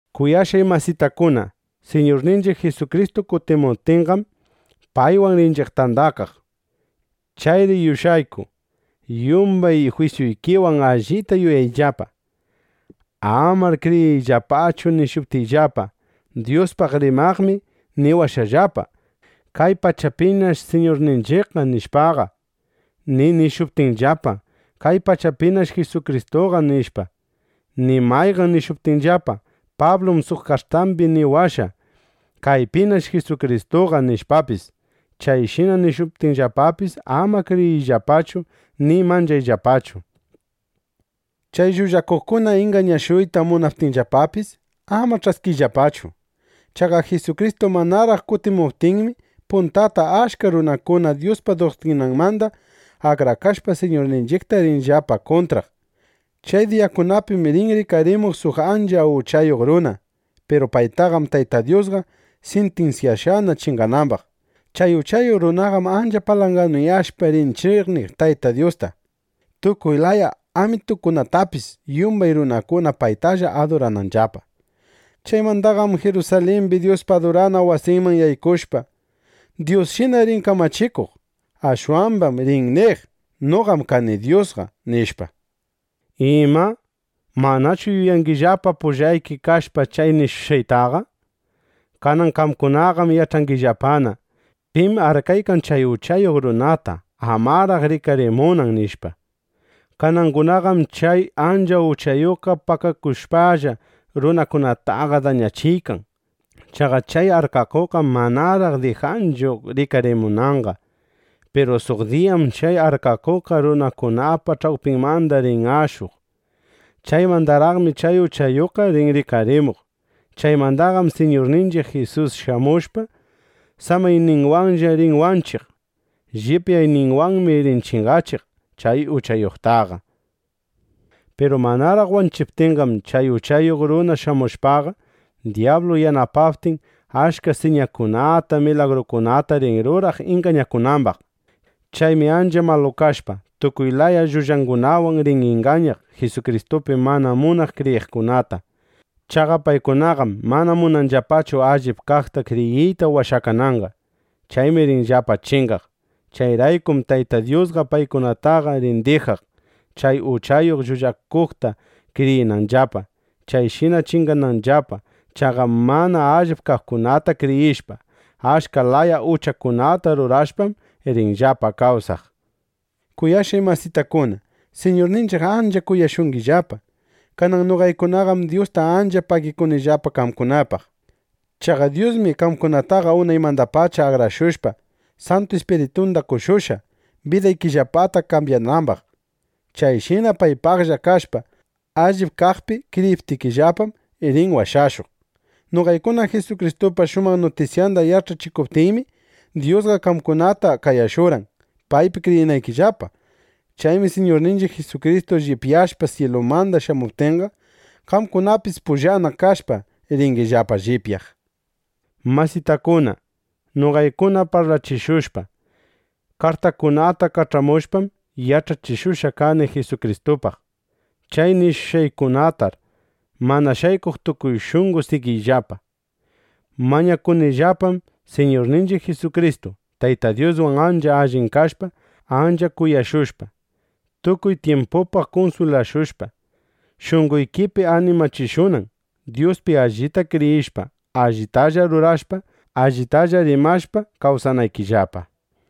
Kuyashqay masitakuna, Siñurninchiq Jisukristu kutimuptinqam, paywan rinchiq tandakaq. Chayri yush'ayku yumbay jwisyuykiwan allita yuyayllapa. Amar kriyiyllapachu nishuptinllapa: “Dyuspaq rimaqmi niwashqallapa: Kay pachapinash Siñurninchiqqa”, nishpaqa, ni nishuptinllapa: “Kaypinash Jisukristuqa”, nishpa, ni mayqan nishuptinllapa: “Pablum suq kartambi niwashqa: ‘Kaypinash Jisukristuqa’”, nishpapis. Chayshina nishuptinllapapis, ama kriyiyllapachu ni manchayllapachu. Chay llullakuqkuna ingañashuyta munaptinllapapis, ama ch'askiyllapachu. Chaqa Jisukristu manaraq kutimuptinmi, puntata achka runakuna Dyuspa duktrinanmanda akrakashpa, Siñurninchiqta rinllapa kuntraq. Chay diyakunapim rin rikarimuq suq ancha uchayuq runa. Piru paytaqam Tayta Dyusqa sintinsyashqana chinganambaq. Chay uchayuq runaqam ancha palanganuyashpa rin ch'iqniq Tayta Dyusta, tukuy laya amitukunatapis, yumbay runakuna paytalla adurananllapa. Chaymandaqam Jirusalimbi Dyuspa adurana wasinman yaykushpa, Dyusshina rin kamachikuq. Ashwambam rin niq: “Noqam kani Dyusqa”, nishpa. Ima, ¿manachu yuyangillapa pullayki kashpa chay nishushqaytaqa? Kanan qamkunaqam yach'angillapana: Pim arkaykan chay uchayuq runata, amaraq rikarimunan, nishpa. Kanangunaqam chay ancha uchayuqqa pakakushpalla, runakunataqa dañachiykan. Chaqa chay arkakuqqam manaraq dijanchu rikarimunanqa. Piru suq diyam chay arkakuqqa runakunapa ch'awpinmanda rin ashuq. Chaymandaraqmi chay uchayuqqa rin rikarimuq. Chaymandaqam Siñurninchiq Jisus shamushpa, samayninwanlla rin wanchiq. Llipyayninwanmi rin chingachiq chay uchayuqtaqa. Piru manaraq wanchiptinqam, chay uchayuq runa shamushpaqa, dyablu yanapaptin, achka siñakunata, milagrukunata rin ruraq ingañakunambaq. Chaymi ancha malu kashpa, tukuy laya llullangunawan rin ingañaq Jisukristupi mana munaq kriyiqkunata. Chaqa paykunaqam mana munanllapachu allip kaqta kriyiyta washakananqa. Chaymi rinllapa chingaq. Chayraykum Tayta Dyusqa paykunataqa rin dijaq, chay uchayuq llullakuqta kriyinanllapa, chayshina chingananllapa. Chaqa mana allip kaqkunata kriyishpa, achka laya uchakunata rurashpam, rinllapa kawsaq. Kuyashqay masitakuna, Siñurninchiq ancha kuyashungillapa. Kanan noqaykunaqam Dyusta ancha pagikunillapa qamkunapaq. Chaqa Dyusmi qamkunataqa unaymandapacha akrashushpa, Santu Ispiritunda qoshushqa, bidaykillapata kambyanambaq. Chayshina paypaqlla kashpa, allip kaqpi kriyiptikillapam, rin washashuq. Noqaykuna Jisukristupa shumaq nutisyanda yach'achishuptiymi, Dyusqa qamkunata qayashurqan, paypi kriyinaykillapa. Chaymi Siñurninchiq Jisukristu llipyashpa syilumanda shamuptinqa, qamkunapis pullanna kashpa, ringillapa llipyaq. Masitakuna, noqaykuna parlachishushpa, kartakunata kach'amushpam, yach'achishushqa kani Jisukristupaq. Chay nishushqaykunatar mana shaykuq tukuy shunqo sigiyllapa. Mañakunillapam, Siñurninchiq Jisukristu, Tayta Dyuswan ancha allin kashpa, ancha kuyashushpa, tukuy tyimpupaq kunswilashushpa, shunqoykipi animachishunan, Dyuspi allita kriyishpa, allitalla rurashpa, allitalla rimashpa kawsanaykillapa.